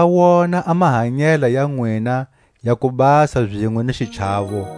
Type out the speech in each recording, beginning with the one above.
na va wona a mahanyela ya nwina ya kubasa zinwe ni xichawo.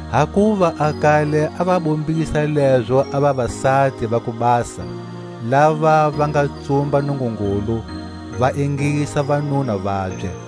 Hakuva a kale a va bombisa lezo a vavasati va kubasa, lava va nga tsumba Nungungulu, va ingisa vanuna vabye.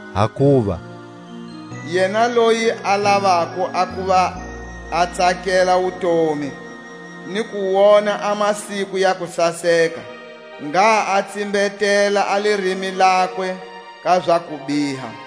Hakuva: Yena loyi a lavako a kuva a tsakela wutomi Ni ku wona a masiku ya kusaseka, Ngha a tsimbetela a lirimi lakwe ka za kubiha,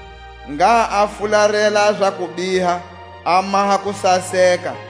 Ngha a fularela a za kubiha, a maha kusaseka;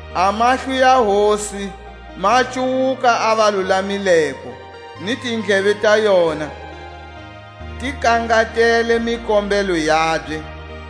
A mahlo ya Hosi ma cuwuka a valulamileko, Ni tindleve ta yona ti kangatele mikombelo yabye;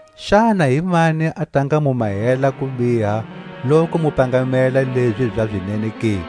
Xana himani a ta nga mu mahela kubiha loku mu pangamela lezi za zinene ke?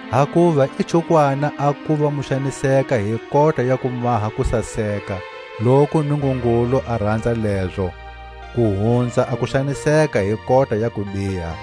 Hakuva i chukwana a kuva mu xaniseka hi kota ya ku maha kusaseka, loku Nungungulu a ranza lezo, ku hunza a ku xaniseka hi kota ya kubiha.